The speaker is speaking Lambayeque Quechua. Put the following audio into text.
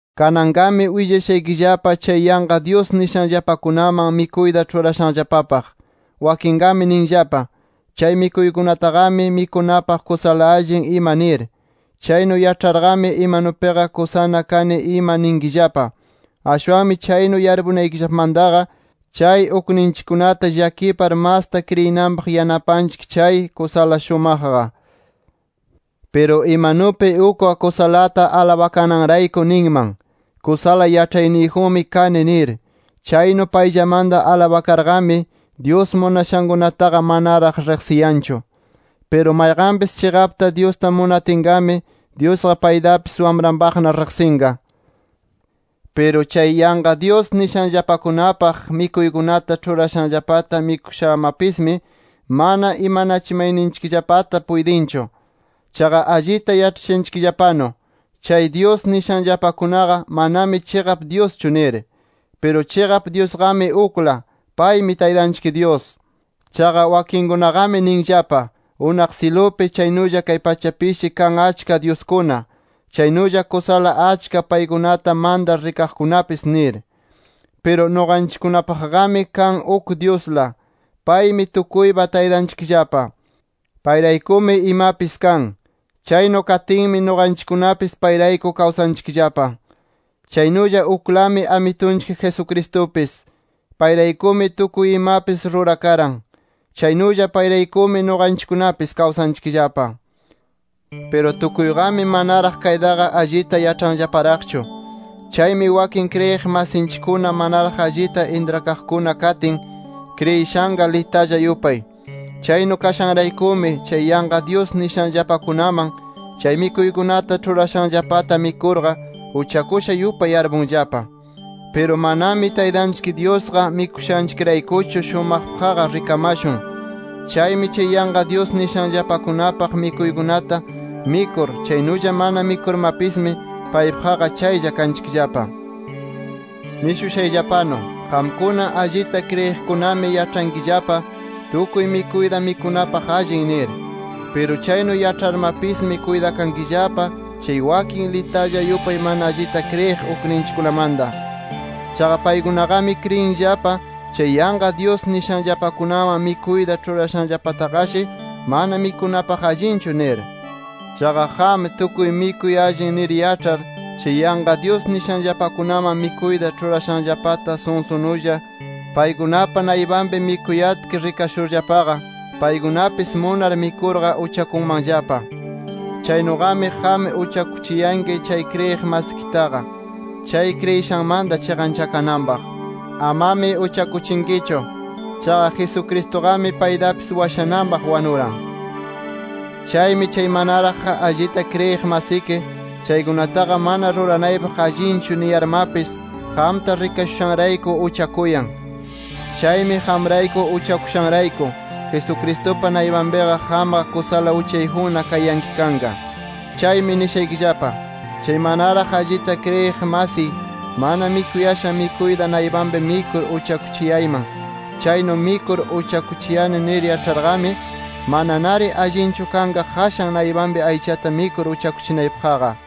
Kananqami willashaykillapa chay yanqa dyus nishanllapakunaman mikuyta ĉhurashanllapapaq. Wakinqami ninllapa: Chay mikuykunataqami, mikunapaq kusala allin ima nir. Chaynu yaĉharqami, imanupiqa kusana kani ima ninkillapa. Ashwanmi chaynu yarpunaykillapamantaqa, chay ukninchikkunata llakipar masta kriyinanpaq yanapanchik chay, kusala shumaqqa. Piru imanupi ukqa kusalata alabakananrayku ninman: Kusala yaĉhayniyjunmi kani nir. Chaynu payllamanta alabakarqami, Dyus munashankunataqa manaraq riqsiyanchu. Piru mayqanpis chiqapta Dyusta munatinqami, Dyusqa paytapis wamranpaqna riqsinqa. Piru chay yanqa dyus nishanllapakunapaq mikuykunata ĉhurashanllapata mikushamapismi, mana imanachimayninchikllapata puytinchu. Chaqa allita yaĉhashanchikllapanu, chay dyus nishanllapakunaqa, manami chiqap Dyuschu nir. Piru chiqap Dyusqami ukla, paymi Taytanchik Dyus. Chaqa wakinkunaqami ninllapa, unaq syilupi, chaynulla kay pachapishi kan achka dyuskuna, chaynulla kusala achka paykunata mantar rikaqkunapis nir. Piru nuqanchikkunapaqmi kan uk Dyusla. Paymi tukuypa Taytanchikllapa. Payraykumi imapis kan. Chaynu katinmi nuqanchikkunapis payrayku kawsanchikllapa. Chaynulla uklami Amitunchik Jesucristupis. Payraykumi tukuy imapis rurakaran. Chaynulla payraykumi nuqanchikkunapis kawsanchikllapa. Piru tukuyqami manaraq kaytaqa allita yaĉhanllaparaqchu. Chaymi wakin kriyiq masinchikkuna manaraq allita intrakaqkuna katin, kriyishanqa litalla yupay. Chaynu kashanraykumi, chay yanqa dyus nishanllapakunaman chay mikuykunata ĉhurashanllapata mikurqa uchakusha yupay yarpunllapa. Piru manami Taytanchik Dyusqa mikushanchikraykuchu, shumaqpaqqa rikamashun. Chaymi chay yanqa dyus nishanllapakunapaq mikuykunata mikur, chaynulla mana mikurmapismi, paypaqqa chaylla kanchikllapa. Nishushayllapanu: Qamkuna allita kriyiqkunami yaĉhankillapa tukuy mikuyta mikunapaq allin nir. Piru chaynu yaĉharmapismi kuytakankillapa chay wakin litalla yupay mana allita kriyiq ukninchikkunamanta. Chaqa paykunaqami kriyinllapa chay yanqa dyus nishanllapakunaman mikuyta ĉhurashanllapataqashi mana mikunapaq allinchu nir. Chaqa qam tukuy mikuy allin nir yaĉhar, chay yanqa dyus nishanllapakunaman mikuyta ĉhurashanllapata sunsunulla paykunapa naypanpi mikuyatki rikashurllapaqa, paykunapis munar mikurqa uchakunmanllapa. Chaynuqami qam uchakuchiyanki chay kriyiq masikitaqa chay kriyishanmanta chiqanchakananpaq. ¡Amami uchakuchinkichu! Chaqa Jesucristuqami paytapis washananpaq wanuran. Chaymi chay manaraq allita kriyiq masiki, chaykunataqa mana ruranaypaq allinchu niyarmapis qamta rikashushanrayku uchakuyan. Chaymi qamrayku uchakushanrayku, Jesucristupa naypanpiqa qamqa kusala uchayjunna kayanki kanqa. Chaymi nishaykillapa: Chay manaraq allita kriyiq masiy, mana mikuyashan mikuyta naypanpi mikur uchakuchiyayman. Chaynu mikur uchakuchiyani nir yaĉharqami, mananari allinchu kanqa qashan naypanpi aychata mikur uchakuchinaypaqqa.